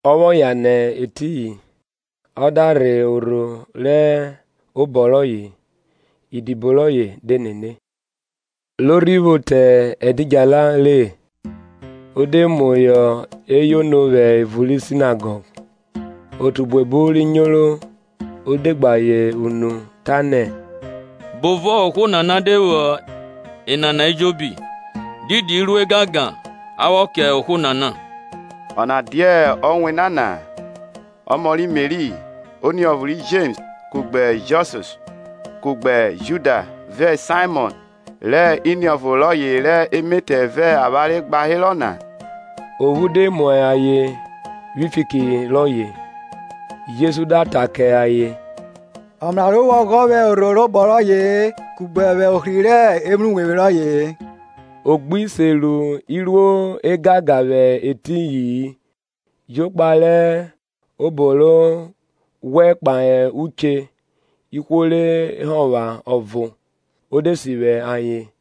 Ọ vwọ yan nẹ etiyin ọ da rhe orho rẹ obọ rọye; idibo rọye de nene. Ro rhi vwo te ẹdidjala re, o de muhọ eyono vwẹ evun ri sinagọg: otu buebu ri nyoro o de gbe ayen unu, ta nẹ; Bovọ ohwo nana de vwo enana ejobi? Didi iruo egangan a vwọ kẹ ohwo nana, Ọna dia ọ wẹna na-a, ọmọ ri Meri; oniọvo ri Jems, kugbe Josis, kugbe Juda, vẹ Saimọn, rẹ iniọvo rọye rẹ emetẹ vẹ avwanre gba herọ na? Ophu de mu ayen vwi fiki rọye. Jesu da ta kẹ ayen, Ọmraro vwo ọghọ vwẹ orho rẹ obọ rọye-e kugbe vwẹ ohri rẹ evwruwevwi rọye-e. O gbi se ru iruo ẹgangan vwẹ etiyi-in, jokpa rẹ obọ rọ ghwẹ kpahe uche ihwo re hovwan ọvo, o de sivwi ayen.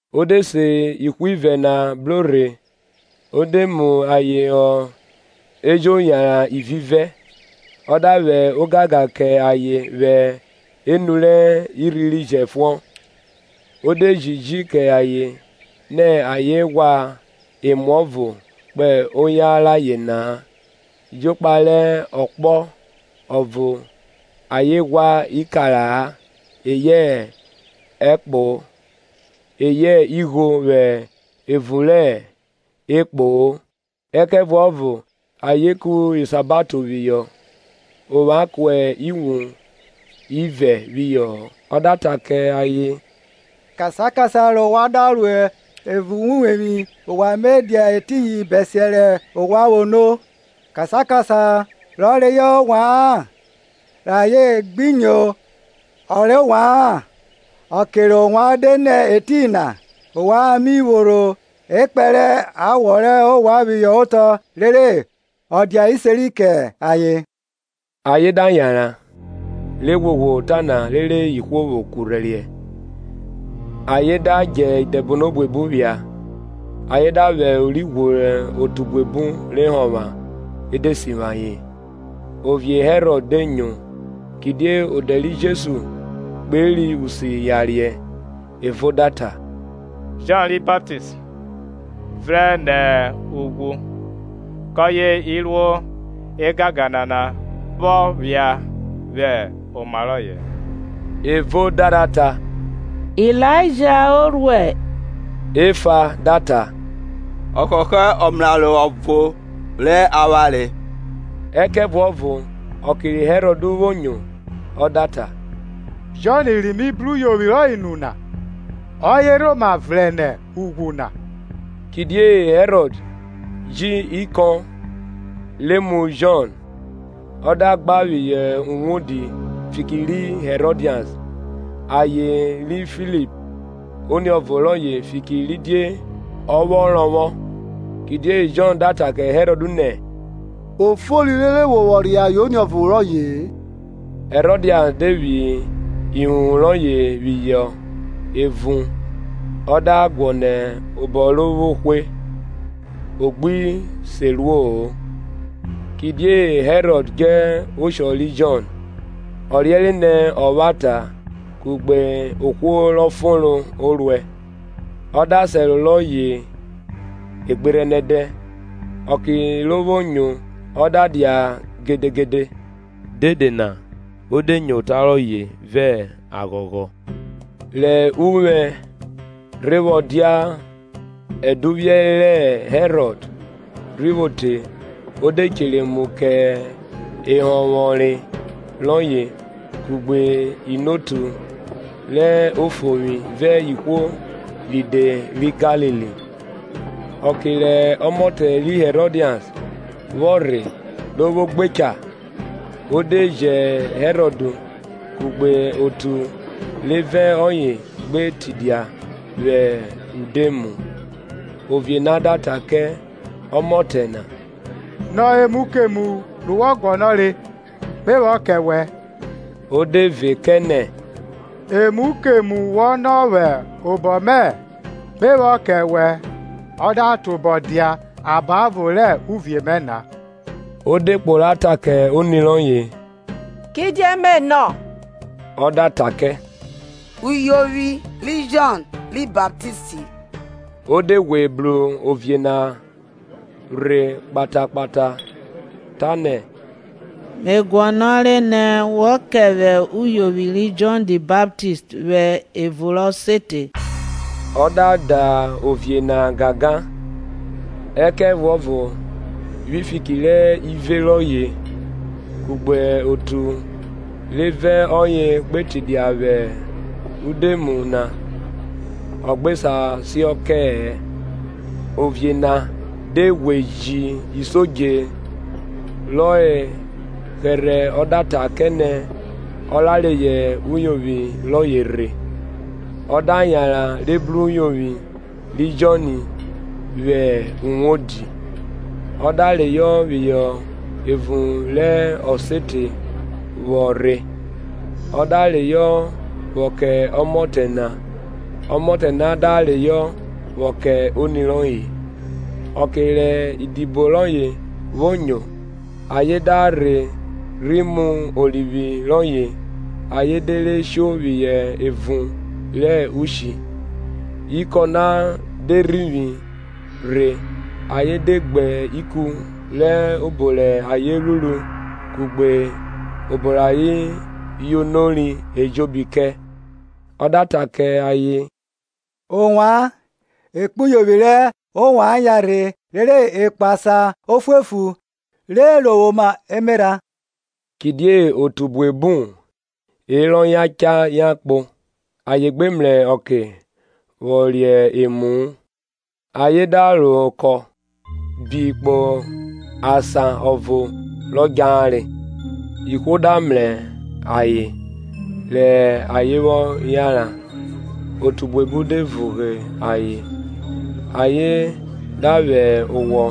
O de se ihwivẹ na bro rhe o de mu ayen họ ejo yanran ivivẹ; ọ da vwẹ ogangan kẹ ayen vwẹ enu rẹ irhi ri jẹfuọn; o de jiji kẹ ayen nẹ ayen ghwa emuọvo kpo oyan rayen na-a, jokpa rẹ ọkpọ ọvo ayen ghwa ikara-a eyẹ ẹkpo, eyẹ igho vwẹ evun rẹ ekpoo; ẹkẹvuọvo ayen ku isahato phihọ; ovwan kuẹ iwun ivẹ phihọ-ọ. Ọ da ta kẹ ayen, kasan kasan re ovwan da ro evun rẹ uwevwi, ovwan Me dia etiyin bẹsiẹ rẹ ovwan vwo no. Kasan kasan rọ reyọ ovwa-an, re ayen gbi nyo ọ rẹ ovwa-an, ọke rẹ ovwan de nẹ etiyin na, ovwan mi phorho ekpẹn rẹ awọ rẹ ovwan phihọ otọ rere ọ dia iseri kẹ ayen. Ayen da yanran, re ghwoghwo ota na rere ihwo vwo kurhẹriẹ; Ayen da djẹ idẹbono buebu phia, ayen da vwẹ ori ghworo otu buebu re hovwan e de sivwi ayen. Ovie Herọd de nyo; kidie odẹ ri Jesu kperi usi yariẹ. Evo da ta, Jọn ri Baptist vrẹn nẹ ughwu, kọye iruo egangan nana vwọ vwo phia vwẹ oma rọye. Ẹvọ da rha ta, Ilaija o ruẹ, Efa da ta, Ọ họhọ ọmraro ọvo rẹ awanre. Ẹkẹvuọvo ọke ri Herọd vwo nyo, ọ da ta, Jọn ri mi bru uyovwi nu na, ọye rhoma vrẹn nẹ ughwu na. Kidie Herọd ji ikọn re mu Jọn, ọ da gba phihọ uwodi fiki ri Hẹrọdias aye ri Filip oniọvo rọye fikiridie ọ vwọ rọvwọ; Kidie Jọn ta kẹ Herọd nẹ, O fori rere ọ wọ reyọ aye re oniọvo rọye-e. Hẹrodias de phi ihuhn rọye phihọ evun o da guọnọ obo ro vwo hwe, o gbi se ruo-o; Kidie Herọd djẹ oshọ ri Jọn ọ riẹnre nẹ ọvwata kugbe ohwo rọ fonro o ruẹ, ọ da sẹro rọye egberhẹnẹdẹ. Ọkẹ ro vwo nyo, ọ da dia gedegede; dede na o de nyo ota rọye vẹ aghọghọ. Rẹ uphẹ rhe vwọ dia ẹduvwiẹ rẹ Herọd rhi vwo te o de chere emu kẹ ehọnvwọnre rọye kugbe inotu rẹ ofovwi vẹ ihwo ride ri Galili; Ọke rẹ ọmọtẹ ri Hẹrọdias vwọ rhe ro vwo gbe eha, o de jẹ Herọd kugbe otu re vẹ ọye gbe tidia vwẹ udoemu; ovie na da ta kẹ ọmọtẹ na, Nọ emu kemu ro wọ guọnọre, me vwọ kẹ wẹ. O de ve kẹ nẹ, Emu kemu wọ nọ vwẹ obọ mẹ, Me vwọ kẹ wẹ, ọ da tobọ dia abọvo rẹ uvie mẹ na. O de kpo ra ta kẹ oni rọye, kidie me nọ? Ọ da ta kẹ, Uyovwi ri Jọn ri Baptist. Ọ de ghwe bru ovie na rhe kpata kpata, tanẹ, Mẹ, guọnọre ne wọ kẹ vwẹ uyovwi ri Jọn ri Baptist vwẹ evun rẹ ọsete. Ọ da da ovie na gangan; ẹkẹvuọvo vwi fiki rẹ ive rọye, kugbe otu re vẹ ọye gbe tidia vwẹ udoemu na, ọ gbe sa siọn kẹ-ẹ. Ovie na de ghwe ji isodje rọ hẹrhẹ ọ da ta kẹ nẹ ọ ra reyọ uyovwi rọye rhe; ọ da yanran re bru uyovwi ri Jọn vwẹ uwodi, ọ da reyọ phihọ evun rẹ ọsete vwo rhe, ọ da reyọ vwọ kẹ ọmọtẹ na; ọmọtẹ na da reyọ vwọ kẹ oni rọye. Ọke rẹ idibo rọye vwo nyo, ayen da rhe rhi mu orivwi rọye ayen de re sho phihọ evun rẹ ushi. Ikọn na de rhivwi rhe ayen de gbe ikun rẹ obo rẹ ayen ruru kugbe obo rẹ ayen yonori ejobi kẹ. Ọ da ta kẹ ayen, ovwan, ekpuyovwi rẹ ovwan yanrhe rere e kpo asan ofuefu, re rovwoma emerha. Kidie otu buebu herọ yan cha yan kpo, ayen gbe mrẹ ọke vwọ re emu-u. Ayen da ro okọ bi kpo asan ọvo rọ djahere. Ihwo da mrẹ ayen rẹ ayen vwọ yanran, otu buebu de vughe ayen, ayen da vwẹ owọ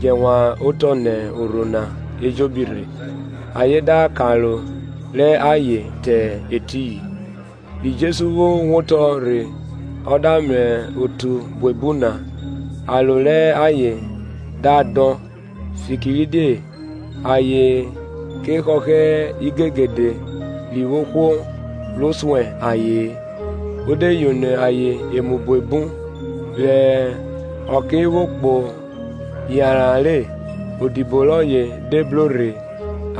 djẹ wan otọ nẹ orho na ejobi rhe ayen da karo rẹ ayen te etiyin. Ri Jesu vwo wotọ rhe ọ da mrẹ otu buebu na, aro rẹ ayen da dọn, fikirdie ayen ke họhọ igegede ri vwo ohwo ro suẹn aye-en; o de yono ayen emu buebu. Rẹ ọke vwo kpo yanran re, idibo rọye de bro rhe,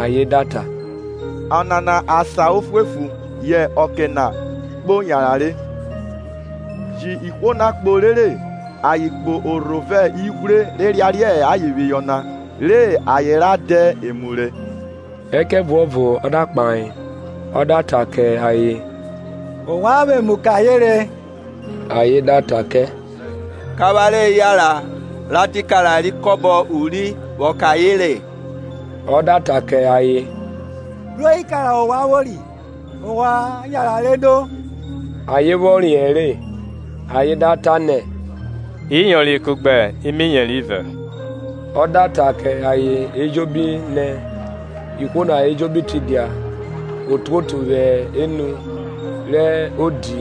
ayen da ta, Ọnana asan ofuefu yẹ ọke na kpo yanran re; ji ihwo na kpo rere ayen kpo orho vẹ ighwre re yariẹ ayen phihọ na re ayen ra dẹ emu re. Ẹkẹvuọvo ọ da kpahe ọ da ta kẹ ayen, ovwan vwe emu kẹ ayen re. Ayen da ta kẹ, kẹ avwanre yanran ra dẹ ikara re ikọba uri vwọ kẹ ayen re? Ọ da ta kẹ ayen, Bro ikara ovwan vwori? Ovwan yanran re no. Ayen vwọ riẹn re ayen da ta nẹ, Iyori, kugbe imiyeri ivẹ. Ọ da ta kẹ ayen ejobi nẹ ihwo na ejobi tidia otuotu vwẹ enu rẹ odi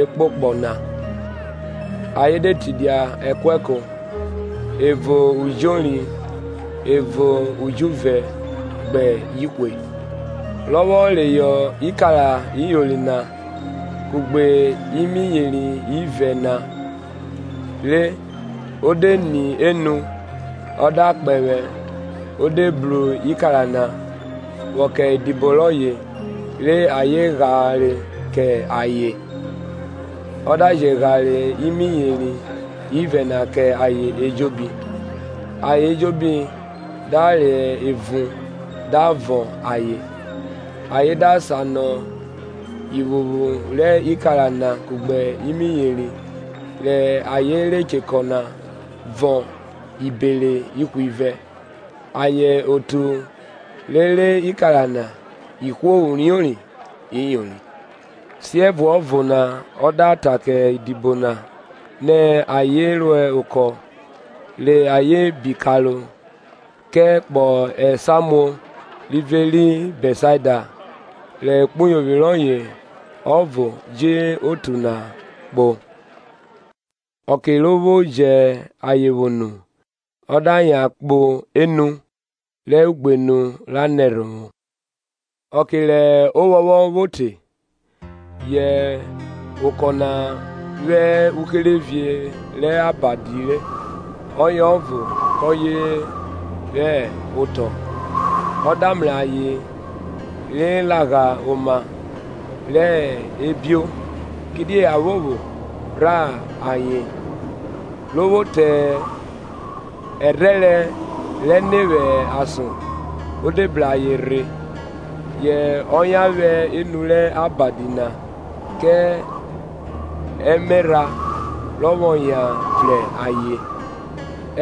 ekpokpọ na. Ayen de tidia ẹkuẹko, ẹvo ujori ẹvo ujuvẹ gbẹ ihwe. Rọ vwọ reyọ ikara iyori na kugbe imiyeri ivẹ na re o de ni enu, ọ da kpẹvwẹ o de bru ikara na; vwọ kẹ idibo rọye re ayen ghare kẹ ayen; ọ da je ghare imiyeri ivẹ na kẹ ayen ejobi. Ayen ejobi da re, evun da vọn ayen. Ayen da sanọ ivwuvwu rẹ ikara na kugbe imiyeri rẹ ayen re chekọ na vọn ibere ihwivẹ. Ayen otu re re ikara na ihwo uriori iyori. Siẹvuọvo na ọ da ta kẹ idibo na nẹ ayen ro okọ re ayen bi karo kẹ kpọ esamuo rivẹ ri Bẹtsaida, re ekpuyovwi rọye ọvo ji otu na kpo. Ọke ro vwo jẹ ayen vwo nu, ọ da yan kpo enu rẹ ugbenu ra nẹ ẹrhovwo. Ọke rẹ ovwọnvwọn vwo te, yẹ okọ na hẹ uherevie rẹ abadi re ọye ọvo kọye hẹ otọ. Ọ da mrẹ ayen re Lagha oma rẹ ebio, kidie aphopho rhan ayen, ro vwo te ẹrhẹrẹ rẹne vwẹ ason o de bru ayen rhe, yẹ ọ yan vwẹ enu rẹ abadi na kẹ emerha rọ vwọ yan vrẹn ayen;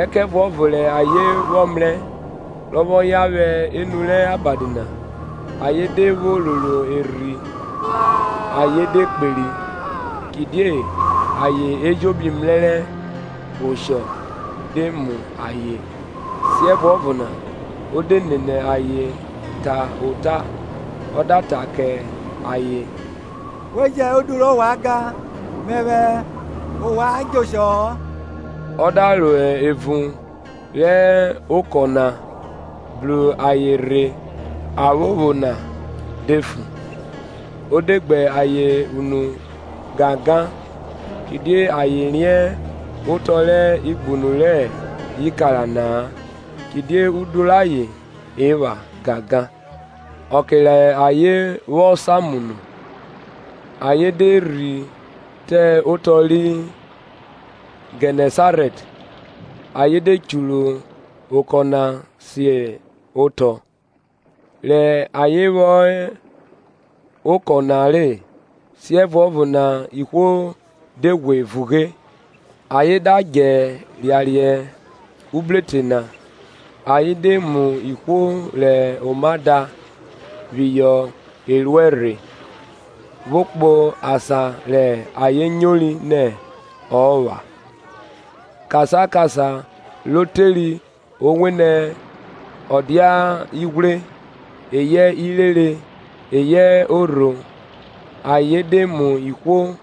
ẹkẹvuọvo rẹ ayen vwọ mrẹ rọ vwọ yan vwẹ enu rẹ abadi na, ayen de vwo roro erhi ayen de kperi; kidie ayen ejobi mrẹrẹ oshọ de mu ayen. Siẹvuọvo na ọ de nene ayen ta ota, ọ da ta kẹ ayen, We jẹn udu rẹ ovwan gan, mẹvwẹ ovwan djẹ oshọ-ọ. Ọ da ro evun rẹ okọ na bru ayen rhe aphopho na de fu; o de gbe ayen unu gangan, Kidie ayen riẹn otọ rẹ igbunu rẹ ikara na-a, kidie udu rayen epha gangan. Ọke re ayen vwọ samu nu, ayen de rhi te otọ ri Gẹnẹsarẹt, ayen de churu oko na si otọ. Rẹ ayen vwo hẹ okọ na re, siẹvuọvo na ihwo de ghwe vugbe. Ayen da djẹ yariẹ ubrotọ na ayen de mu ihwo rẹ oma da phihọ eruẹ rhe, vwo kpo asan rẹ ayen nyori nẹ ọ epha. Kasan kasan ro teri owenẹ ọ dia ighwre, eyẹ irere eyẹ orho ayen de mu ihwo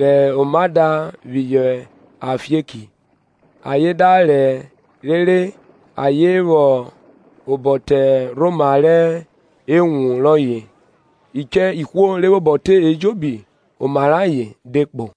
rẹ oma da phihọ afieki, ayen da rẹ rere ayen vwẹ obọ te orhoma rẹ ewun rọye; uche ihwo re vwẹ obọ te ejobi oma rẹ ayen de kpo.